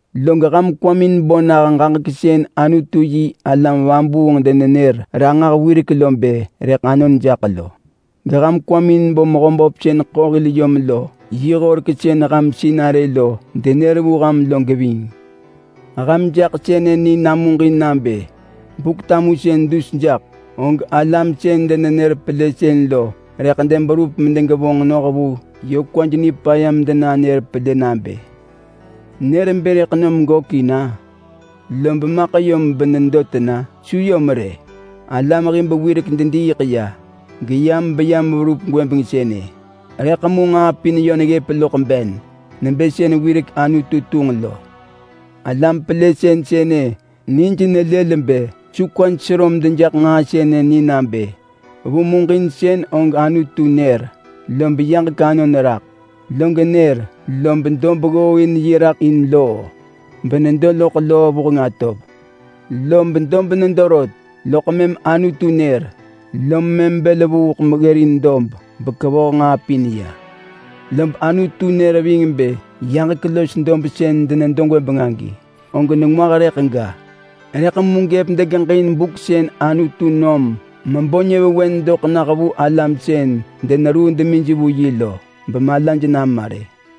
Log ham kwamin bo nah ġaġek sën Anutu-yi-alam-vabuung denenër ranġah wirek bë rëḳ anon jaḳ lo. Geham kwamin bo Mehöböp sën ḳo hil yom lo yi horek sën ham sinarë lo denër vu ham lo geving. Ham jaḳ sënë ni namuġin nabë Buk-tamusën dus jaḳ, og alam sën denenër pelësën lo rëḳ deberup bedegevonġ noh vu kwaj nipaya medenanër pelë nabë, “Nër bë rëḳ nom gökin-a? Lob maḳ yom benedo tena? Su yom rë! Alam hib wirek dediiḳ ya, geyam beyam verup gwëbeng sënë, rëḳ mu nġaa pin yö neggëp loḳ ben nebë sën wirek Anutu tunġ lo.” Alam pelësën sënë nij nelël bë su kwaj sero medejaḳ nġaa sënë ni nabë: Vu muġinsën og Anutu nër, lob yaġek anon raḳ. Log nër, lob dob ggooin yi raḳ in loo benedo loḳ loo vuheng atov. Lob dob nedo rot, loḳ mëm Anutu nër, lom mëm bël vuuḳ meggërin dob bekevoh nġaa pin ya. Lob Anutu nër ving bë yaġek los dob sën denedo gwëbeng agi, og nengwah rëḳ ga. Rëḳ mu gëp degeġin buk sën Anutu nom mebo nyëvewen doḳ nah vu alam sën deneruu demij vu yi lo bemalaj nama rë.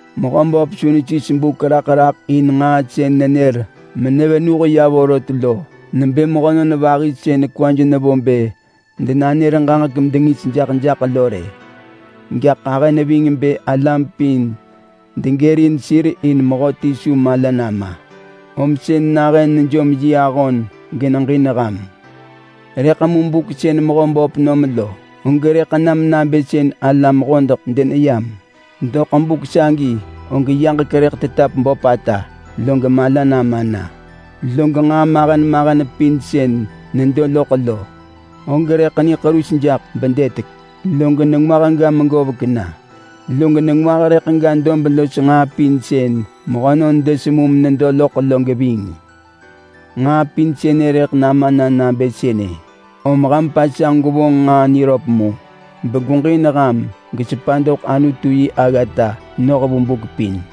Mehöböp su nesis buk raḳ raḳ in nġaa sën nenër menevenuh ya vorot lo nebë mehönon vahi sën kwaj nevo bë denanër ġaġek medengis jaḳ jaḳ lo rë. Gaḳ ahë neving bë alam pin degërin sir in mehöti su mala nama, om sën nahën nejom yi ahon geneġin ham. Rëḳ mu buk sën Mehöböp nom lo, og rëḳ nam nabë sën alam hodeḳ deneyam. Doḳ buk sagi, og yaġek rëḳ tetap böpata log mala nama na. Log nġaa mahen mahen pin sën nedo loḳ lo, og rëḳ niḳerus jaḳ bedëtek, log nengwah ga megovek na. Log nengwah rëḳ ga dob los nġaa pin sën mehönon desemu menedo loḳ lo geving. Nġaa pin sënë rëḳ nama na nabë sënë. Om ham pasanġ gwevonġ nġaa niröp mu, begweġin ham gesepa doḳ Anutu yi aggata noh vu buk pin.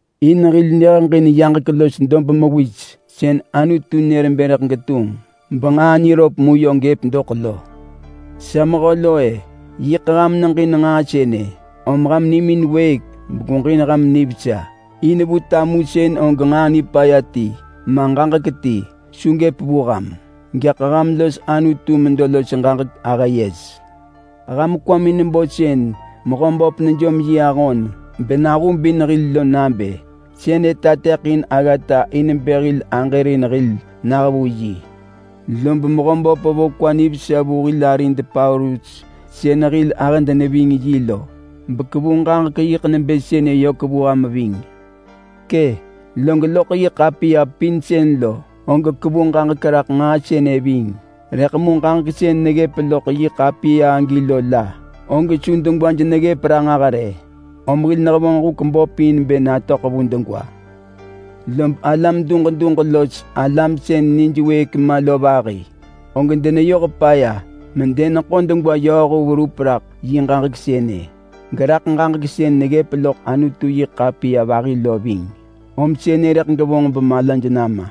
In hil neheġin yaġek los dob mewis sën Anutu nër bë rëḳ getunġ benġaa niröp mu yö gëp doḳ lo. Sa mehö lo-e, yiḳ ham neġin nġaa sënë, om ham nimin wëëk begweġin ham nivesa in vu tamusën og nġaa nipaya ti, ma ġaġek ti, su gëp vu ham. Gaḳ ham los Anutu medo los ġaġek ahë yes. Rëḳ ham kwamin bo sën Mehöböp nejom yi ahon benahubin hil lo nabë: Sënë tateḳin aggata in bë hil aġërin hil nah vu yi. Lob Mehöböp vo kwa nivesa vu hil arid Paulus sën hil ahëd neving yi lo, bekevu ġaġek yiḳ nebë sënë yök vu ham ving. Kë’! Log loḳ yi ḳapiya pin sën lo, og kevu ġaġek raḳ nġaa sënë ving. Rëḳ mu ġaġek sën neggëp loḳ yi ḳapiya agi lo la, og su degwaj neggëp ranġah rë, om hil nehevonġ huk böp in bë natöḳ vu degwa. Lob alam duġ duġ los alam sën nij wëëk ma lo vahi, og deneyoh paya medeneḳo degwa yööhu verup raḳ yi ġaġek sënë, geraḳ ġaġek sën neggëp loḳ Anutu-yi-ḳapiya vahi lo ving. Om sënë rëḳ gevonġ bemalaj nama.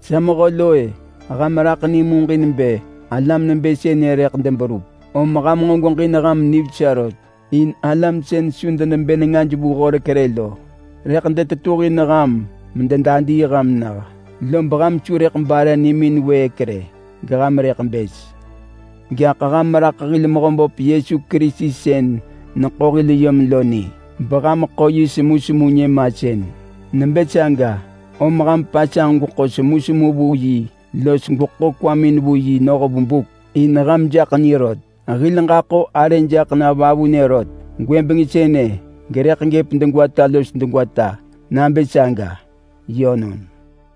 Sa mehö lo-e, ham raḳ ni muġin bë alam nebë sënë rëḳ deberup, om ham nġo gweġin ham nivesa rot. In alam sën su denebë nengaj vu horek rë lo rëḳ detetuhin ham mededadii ham nah, lob ham su rëḳ bare nimin wëëk rë geham rëḳ bës. Gaḳ ham raḳ hil Mehöböp Yesu Kerisi sën neḳo hil yom lo ni beham ḳo yi semusemu nyëmasën. Nebë saga, om ham pasanġ gweḳo semusemu vu yi los gweḳo kwamin vu yi noh vu buk, in ham jaḳ ni rot. Hil ġaḳo arë jaḳ na vavunë rot gwëbeng sënë gerëḳ gëp degwata los degwata nabë saga. Yönon!